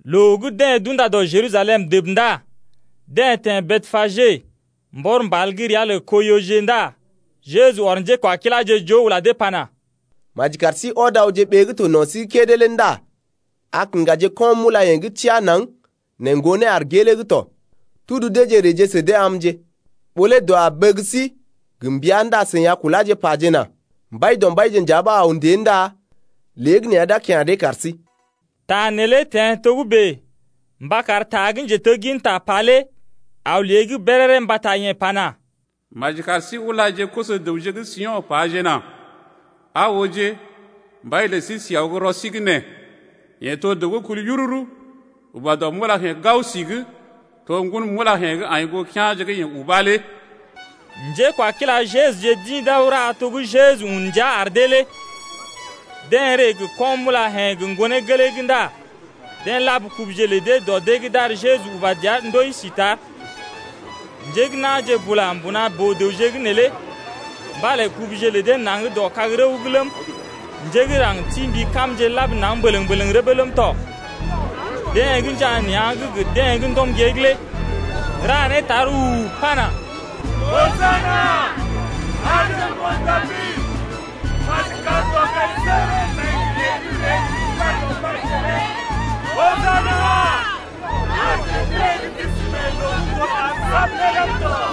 Loo gə́ deḛ d’unda dɔ Jerusalem dəb ndá deḛ teḛ Betpage mbɔr mbal gə́ ria lə Koiyoje ndá Jeju ɔr njékwakiláje joo ula dee pana: Maji kar sí ɔd awje ɓee gə́ to no̰ sí’g kédé lé ndá a kiŋgaje ko̰-mulayḛ̀je gə́ teá naŋg nɛ ŋgonee aar gelee’g tɔ. Tudu deeje reeje sə dee amje. Ɓó lé dəw a bəg sí gə mbəa ndá seḭ a kuláje pajena: Mbaidɔmbaije nja ɓa aw ndée ndá léegəneeya d’a kya̰ dee kar sí. Ta neelé teḛ togə́bè mba kar ta gə́ njetegginta pa lé aw lée’g béréré mbata yeḛ pana: Maji kar sí ulaje koso-dəwje gə́ Sio̰ pajena: Aa ooje, mbai lə sí si aw gə́ rɔ sí’g nee, Yeḛ to dəw gə́ kul yururu, uba dɔ mulayḛ̀je gao si’g. To ŋgon mulayḛ̀je gə́ aḭ goo kea̰je gə́ yeḛ uba lé. Njekwakila Jeju-je d’ḭ d’aw ra to gə́ Jeju un ndia ar dee lé. Deḛ ree gə ko̰-mulayḛ̀je gə ŋgonee gelee’g ndá deḛ lab kubuje lə dee dɔ dee’g d’ar Jeju uba dəa ndoi si tar. Njé gə́ na̰je bula mbuna boo-dəwje’g neelé mbalé kubuje lə dee naŋg dɔ kag-rəw’g ləm, njé gə́ raŋg ti mbi kamje lab naŋg mbələŋ-mbələŋ rəbee ləm tɔ. Deḛ gə́ njaa nea̰’g gə deḛ gə́ ndɔm gée’g lé ra né tar u-u-u pana: Hosana, arje ŋgon Dabid. Maji kar dɔkaisəgərə nai gə yeḛ gə́ ree gə ri Mbaidɔmbaije lé. Hosana, arje deḛ gə́ d’isi mee loo gə́ to tar sab lé ləm tɔ.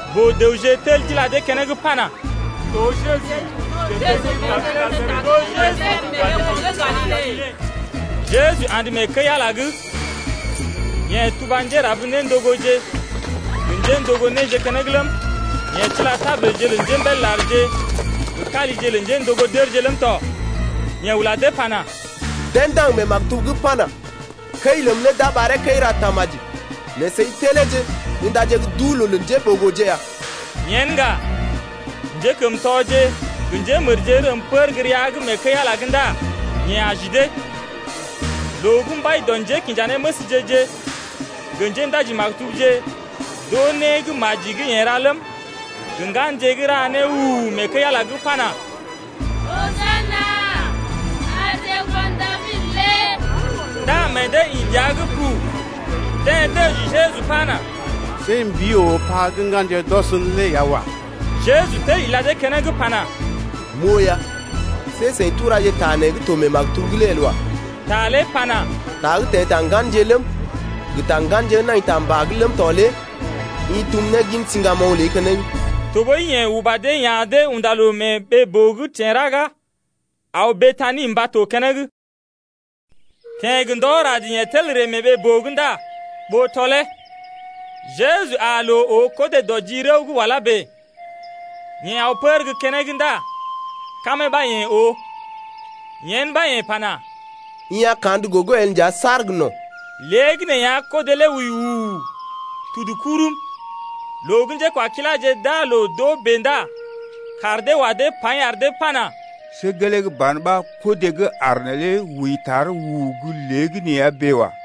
Boo-dəwje tel d’ila dee keneŋ pana: To Jeju, njetegginta gə́ Najaret mee ɓeeko̰ gə́ Galile. Jeju andə mee kəi-Ala’g. Yeḛ tuba njérab-néndogoje gə njéndogo néje keneŋ ləm, yeḛ tila tabulje lə njémbél larje gə kalije lə njéndogo dərje ləm tɔ. Yeḛ ula dee pana: Deḛ ndaŋg mee maktub’g pana: Kəi ləm lé d’a ɓaree kəi-ra-tamaji nɛ seḭ teleeje undaje gə́ duu-loo lə njéɓogoje ya. Yen ŋga, njékəmtɔje rəm pər gə́ rəa’g mee kəi-Ala’g ndá yeḛ aji dee. Loo gə́ mbai dɔ njékinjanéməsje-je gə njéndaji-maktubje d’oo né gə́ maji gə́ yeḛ ra ləm, gə ŋganje gə́ ra né u-u-u mee kəi-Ala’g pana: Hosana arje ŋgon Dabid lé ndá meḛ dee ḭ dəa’g pu. Deḛ dəji Jeju pana: See mbii oo pa gə́ ŋganje d’ɔs’n lé ya wa. Jeju tel ila dee keneŋ pana: M’oo ya. See seḭ turaje ta nee gə́ to mee maktub’g lé el wa. Ta lé pana: Ta gə́ teḛ ta ŋganje ləm, gə ta ŋganje gə́ nai ta mbà’g ləm tɔ lé i tum ne gin siŋgamoŋ ləi keneŋ. Tɔɓəi yeḛ uba dee ya̰ dee unda loo mee ɓee-boo’g teḛ raga aw Betani mba to keneŋ. Teḛ gə́ ndɔ rad yeḛ tel ree mee ɓee-boo ndá ɓó tɔlee. Jeju aa loo oo kodé dɔ ji rəw gə́ wala bèe. Yeḛ aw pər gə́ keneŋ ndá kamee ɓa yeḛ oo. Yen ɓa yeḛ pana: I a kandə gogo el nja saar gə no̰. Léegəneeya kodé lé wəi wuu, tudu kurum. Loo gə́ njékwakiláje d’aa loo d’oo bèe ndá kaar dee wa dee paḭ ar dee pana: See gelee ban ɓa kodé gə́ aar neelé wəi tar wuu gə́ léegəneeya bèe wa.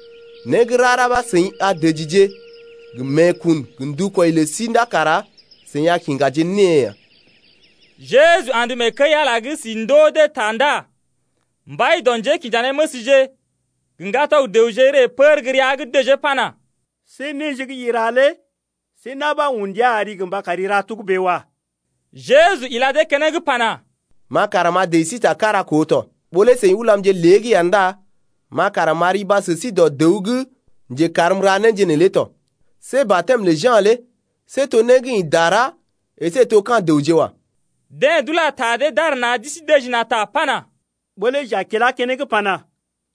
Né gə́ rara ɓa seḭ a dəjije gə meekun gə ndukwɔi lə sí ndá kara seḭ a kiŋgaje née ya. Jeju andə mee kəi-Ala’g si ndoo dee ta ndá mbai dɔ njékinjanéməsje gə ŋgatɔg-dəwje ree pər gə́ rəa’g dəjee pana: See néje gə́ i ra lé see na̰ ɓa un ndia ari gə mba kari ra togə́bè wa. Jeju ila dee keneŋ pana: Ma kara m’a dəji sí ta kára koo tɔ. Ɓó lé seḭ ulamje lée’g ya ndá ma kara m’a riba sə sí dɔ dəw gə́ njekarm m’ra néje neelé tɔ. See batɛm lə Ja̰ lé see to né gə́ ḭ dara əsé to ka̰ dəwje wa. Deḛ d’ula ta dee d’ar na̰ d’isi dəji na̰ ta pana: Ɓó lé j’a kilá keneŋ pana: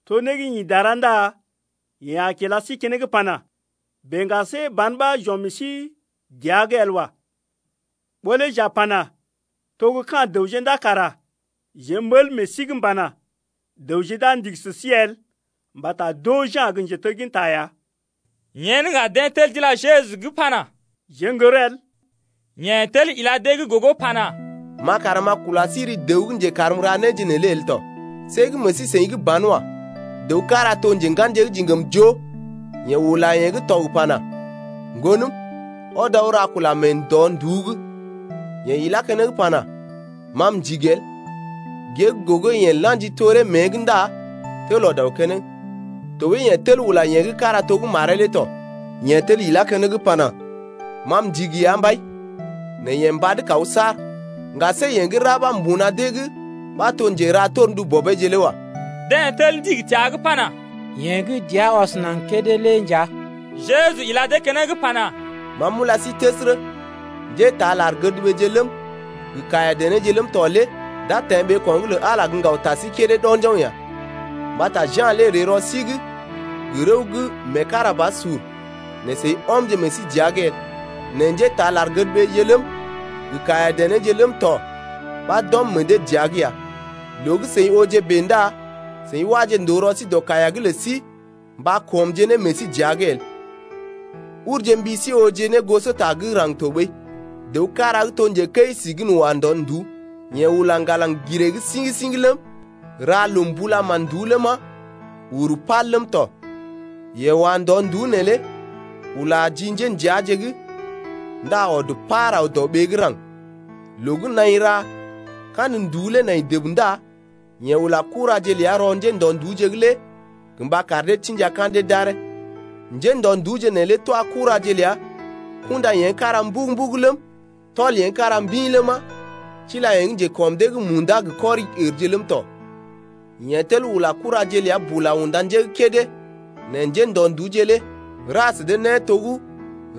To né gə́ ḭ dara ndá yeḛ a kila sí keneŋ pana: Bèe ŋga see ban ɓa j’ɔm meḛ sí dəa’g el wa. Ɓó lé j’a pana: To gə́ ka̰ dəwje ndá kara jeḛ m’ɓəl meḛ sí’g pana: Dəwje d’a ndigi sə sí el mbata d’oo Ja̰ gə́ njetegginta ya. Yen ŋga deḛ tel d’ila Jeju’g pana: Jeḛ n’gər el. Yeḛ tel ila dee’g gogo pana: Ma kara m’a kula sí ri dəw gə́ njekarm m’ra néje neelé el tɔ. See gə́ meḛ sí-seḭ gə́ banwa. Dəw kára to njenganje gə́ diŋgam joo. Yeḛ ula yeḛ gə́ tɔg pana: Ŋgonəm, ɔd aw ra kula mee ndɔ-nduú’g. Yeḛ ilá keneŋ pana: Ma m’ndigi el. Gée gə́ gogo yeḛ la̰ji toree mée’g ndá tel ɔd aw keneŋ. Tɔɓəi yeḛ tel ula yeḛ gə́ kára to gə́ maree lé tɔ. Yeḛ tel ilá keneŋ pana: Ma m’ndigi ya, Mbai. Nɛ yeḛ mbad kaw saar. Ŋga see yeḛ gə́ ra ɓa mbuna dee’g ɓa to njera torndu bɔbeeje lé wa. Deḛ tel ndigi təa’g pana: Yeḛ gə́ dəa ɔs naŋg kédé lé nja. Jeju ila dee keneŋ pana: Ma m’ula sí təsərə, njétaa lar-gədɓeeje ləm, gə kaiya-denéje ləm tɔ lé d’a teḛ ɓeeko̰’g lə Ala lé gə́ ŋgaw ta sí kédé ɗo̰joŋ ya. Mbata Ja̰ lé ree rɔ sí’g gə rəw gə́ meekarabasur nɛ seḭ ɔmje meḛ sí dəa’g el. Nɛ njétaa lar-gədɓeeje ləm, gə kaiya-denéje ləm tɔ ɓa d’ɔm meḛ dee dəa’g ya. Loo gə́ seḭ ooje bèe ndá seḭ waje ndòo rɔ sí dɔ kaiya’g lə sí mba kɔmje ne meḛ sí dəa’g el. Urje mbi sí ooje ne gosota gə́ raŋg tɔɓəi. Dəw kára gə́ to njekəi si gən wa ndɔ-nduú. Yeḛ ula ŋgalaŋ giree’g siŋ-siŋ ləm, ra loo mbula mán-nduú ləma, uru pal ləm tɔ. Yeḛ wa ndɔ-nduú neelé ula ji njéndəaje’g ndá ɔd par aw dɔɓee gə́ raŋg. Loo gə́ naḭ ra kandə nduú lé nai dəb ndá yeḛ ula kuraje ləa rɔ njéndɔ-nduúje’g lé gə mba kar dee tḭja ka̰dee d’aree. Njéndɔ-nduúje neelé twa kuraje ləa kunda yeḛ gə́ kára mbugu-mbugu ləm, tɔl yeḛ gə́ kára mbḭ ləma, tila yeḛ gə́ njekɔm dee gə́ munda gə kɔri-ərje ləm tɔ. Yeḛ tel ula kuraje ləa bula unda njé gə́ kédé nɛ njéndɔ-nduúje lé ra sə dee né to gə́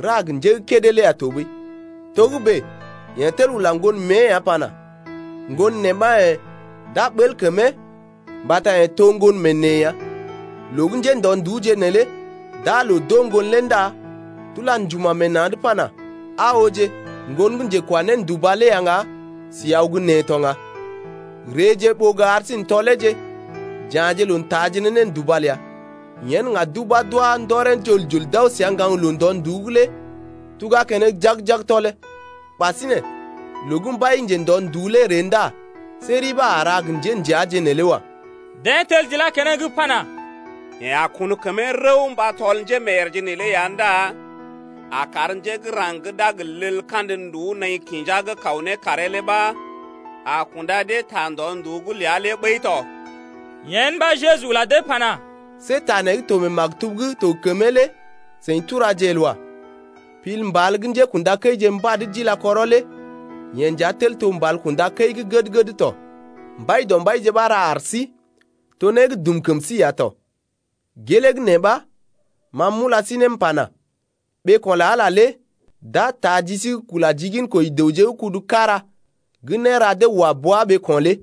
ra gə njé gə́ kédé lé ya tɔɓəi. Togə́bè yeḛ tel ula ŋgon mée ya pana: Ŋgon neḛ ɓa yḛ̀, d’a ɓəl kəmee mbata yeḛ to ŋgon mee neḛ ya. Loo gə́ njéndɔ-nduúje neelé d’aa loo d’oo ŋgon lé ndá d’ula njuma̰ meḛ na̰’d pana: Aa ooje, ŋgon gə́ njekwa-nénduba lé ya ŋga sí aw gə́ nee to ŋga. Reeje ɓó gə ar sí n’tɔleeje, j’ya̰je loo n’taaje ne nénduba ləa. Yen ŋga d’ubá d’wá ndɔree jol-jol d’aw səa ŋgaŋloo ndɔ-nduú’g lé tuga keneŋ jag-jag tɔlee. Ɓasinè, loo gə́ mbai gə́ njendɔ-nduú lé ree ndá see ri ɓa a ra gə njéndəaje neelé wa. Deḛ tel d’ilá keneŋ pana: Yeḛ a kun kəmee rəw mba tɔl njémeeyèrje neelé ya ndá a kar njé gə́ raŋg gə́ d’a gə leel kandə nduú naḭ kinja’g kaw ne karee lé ɓa a kunda dee ta ndɔ-nduú’g ləa lé ɓəi tɔ. Yen ɓa Jeju ula dee pana: See ta nee gə́ to mee maktub gə́ to gə kəmee lé seḭ turaje el wa. Pil mbal gə́ njékṵdakəije mbad d’ila kɔrɔ lé Yee nja tel to mbal kunda dɔ kum kəi gə́ gəd tɔ. Mbaidɔmbaije ɓa ra ar sí. To né gə́ dum kəm sí ya tɔ. Gelee gə́ nee ɓa ma m’ula sí ne m’pana: Ɓeeko̰ lə Ala lé d’a taa ji sí’g kula ji ginkoji dəwje gə́ kudu kára gə́ néra dee wa bua ɓeeko̰ lé.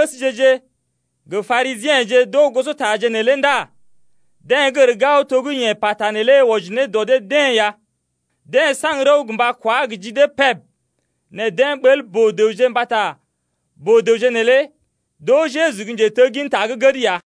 Loo gə́ mbai dɔ njékinjanéməsje-je gə Parisiḛje d’oo gosotaje neelé ndá deḛ gər gao to gə́ yeḛ pata neelé wɔji ne dɔ dee-deḛ ya. Deḛ saŋg rəw gə mba kwá gə ji dee peb nɛ deḛ ɓəl boo-dəwje mbata boo-dəwje neelé d’oo Jeju gə́ njetegginta gə́ gəd ya.